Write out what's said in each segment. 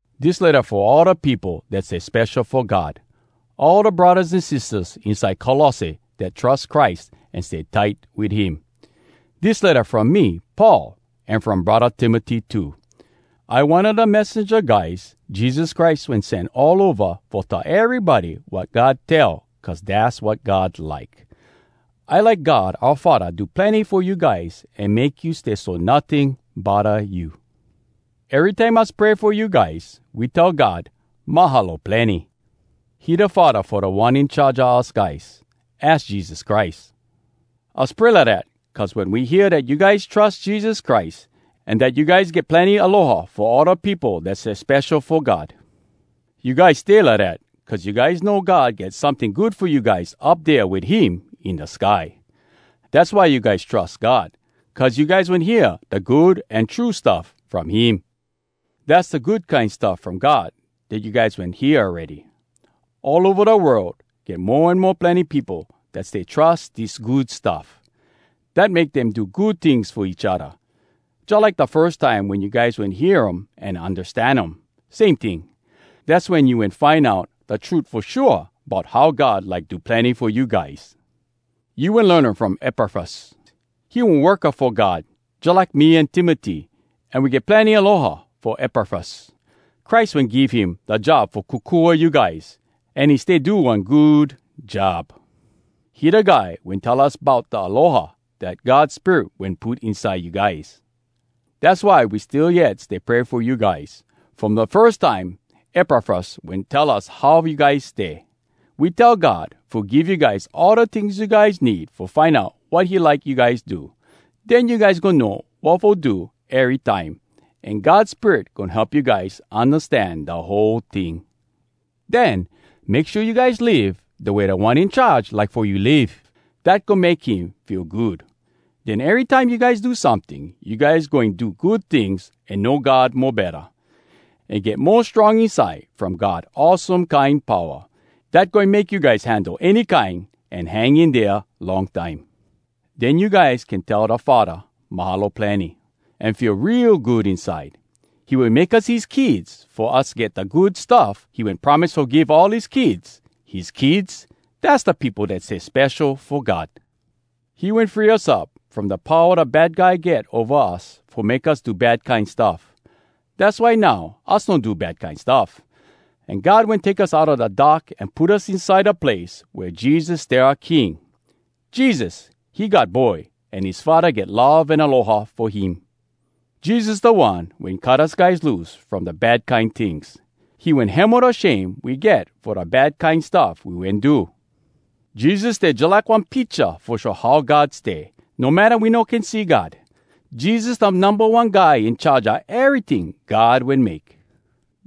Dis letta fo all da peopo dat stay spesho fo God, all da braddahs an sistahs inside Colosse dat trus Christ an stay tight wit him. Dis letta from me, Paul, an from braddah Timoty too. I one a da messenja guys Jesus Christ wen sen all ova fo tell erybody wat God tell cuz dass wat God like. I like God oua Faddah do plenny fo you guys an make you stay so notting bodda you. Erytime us pray fo you guys, we tell God “Mahalo plenny!” He da Faddah fo Da One In Charge a us guys, az Jesus Christ. Us pray lidat cuz we wen hear dat you guys trus Jesus Christ, an dat you guys get plenny aloha fo all da peopo dat stay spesho fo God. You guys stay lidat, cuz you guys know God get someting good fo you guys up dea wit him in da sky. Dass why you guys trus God, cuz you guys wen hear da Good An True Stuff From Him. Dass da Good Kine Stuff From God dat you guys wen hear awready. All ova da world get mo an mo plenny peopo dat stay trus dis Good Stuff. Dat make dem do good tings fo each odda, jalike da firs time wen you guys wen hear um an undastan um, same ting. Dass wen you wen find out da trut fo shua bout how God like do plenny fo you guys. You wen learn um from Epafras. He one worka fo God jalike me an Timoty, an we get plenny aloha fo Epafras. Christ wen give him da job fo kokua you guys, an he stay do one good job. He da guy wen tell us bout da aloha dat God Spirit wen put inside you guys. Dass why we still yet stay pray fo you guys, from da firs time Epafras wen tell us how you guys stay. We tell God fo give you guys all da tings you guys need fo find out wat he like you guys do. Den you guys goin know wat fo do ery time, an God Spirit goin help you guys undastan da whole ting. Den, make shua you guys live da way Da One In Charge like fo you live. Dat goin make him feel good. Den erytime you guys do someting, you guys goin do good tings an know God mo betta, an get mo strong inside from God awesome kine powa, dat goin make you guys handle any kine an hang in dea long time. Den you guys can tell da Faddah “Mahalo plenny!” an feel real good inside. He wen make us his kids fo us get da good stuff he wen promise fo give all his kids: his kids, dass da peopo dat stay spesho fo God. He wen free us up from da powa da Bad Guy get ova us fo make us do bad kine stuff. Dass why now us no do bad kine stuff. An God wen take us outa da dark an put us inside da place wea Jesus stay oua King. Jesus, he God Boy an his Faddah get love an aloha fo him. Jesus da One wen cut us guys loose from da bad kine tings. He wen hemo da shame we get fo da bad kine stuff we wen do. Jesus stay jalike one picha Fo show how God stay, No matta we no can see God. Jesus da Numba One Guy In charge a eryting God wen make.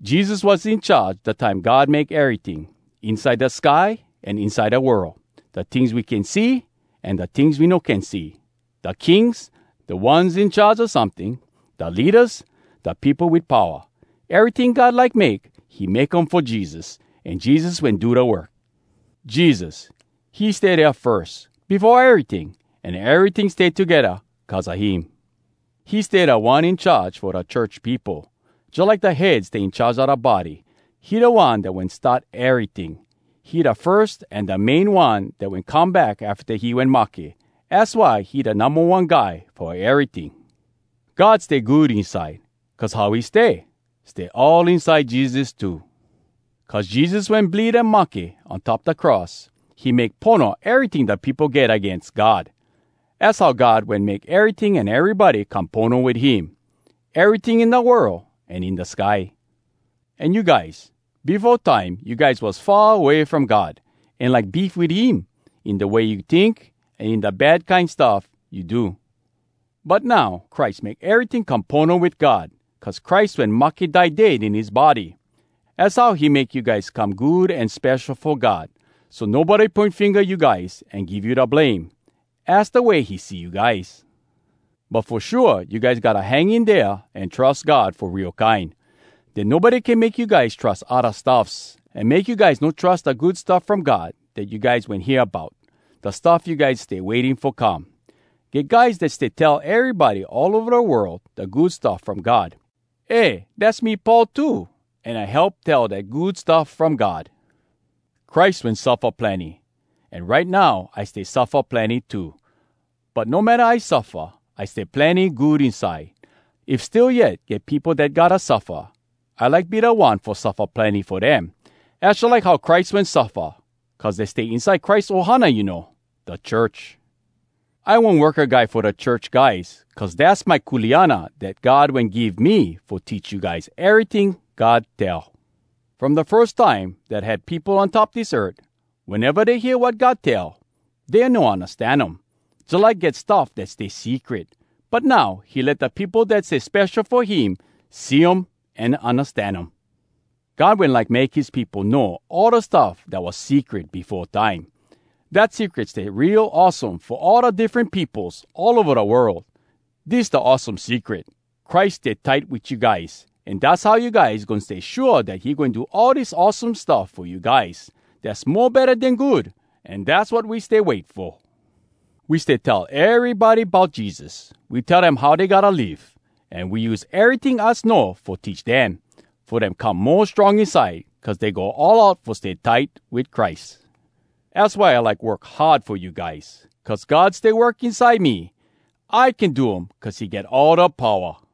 Jesus was in charge da time God make eryting— Inside da sky an inside da world, Da tings we can see an da tings we no can see, Da kings, da ones in charge a someting, Da leadas, da peopo wit powa. Eryting God like make, He make um fo Jesus, An Jesus wen do da work. Jesus, he stay dea firs, befo eryting, An eryting stay togedda cuz a him. He stay Da One In Charge fo da church peopo, Jalike da head stay in charge a da body. He da One dat wen start eryting. He da firs an da main One dat wen come back afta he wen mahke. Az why he da Numba One Guy fo eryting. God stay good inside, cuz how he stay, stay all inside Jesus too. Cuz Jesus wen bleed an mahke on top da cross, he make pono eryting da peopo get agains God. Az how God wen make eryting an erybody come pono wit him—eryting in da world an in da sky. An you guys, befo time you guys was far away from God, an like beef wit him, in da way you tink an in da bad kine stuff you do. But now Christ make eryting come pono wit God cuz Christ wen mahke die dead in his body. Az how he make you guys come good an spesho fo God so nobody poin finga you guys an give you da blame. Az da way he see you guys. But fo shua, you guys gotta hang in dea an trus God fo real kine. Den nobody can make you guys trus odda stuffs, an make you guys no trus da Good Stuff From God dat you guys wen hear bout, da stuff you guys stay waiting fo come. Get guys dat stay tell erybody all ova da world da Good Stuff From God. Eh, dass me Paul too, an I help tell dat Good Stuff From God. Christ wen suffa plenny, an right now I stay suffa plenny too. But no matta I suffa, I stay plenny good inside. If still yet get peopo dat gotta suffa, I like be da one fo suffa plenny fo dem. Az jalike how Christ wen suffa cuz dey stay inside Christ ohana, you know, da church. I one worka guy fo da church guys cuz dass my kuleana dat God wen give me fo teach you guys eryting God tell. From da firs time dat had peopo on top dis earth, weneva dey hear wat God tell, dey no undastan um, jalike get stuff dat stay secret. But now, he let da peopo dat stay spesho fo him see um an undastan um. God wen like make his peopo know all da stuff dat was secret befo time. Dat secret stay real awesome fo all da diffren peopos all ova da world. Dis da awesome secret: Christ stay tight wit you guys, an dass how you guys goin stay shua dat he goin do all dis awesome stuff fo you guys, dass mo betta den good, an dass wat we stay wait fo. We stay tell erybody bout Jesus. We tell dem how dey gotta live. An we use eryting us know fo teach dem, fo dem come mo strong inside cuz dey go all out fo stay tight wit Christ. Az why I like work hard fo you guys. Cuz God stay work inside me, I can do um cuz he get all da powa.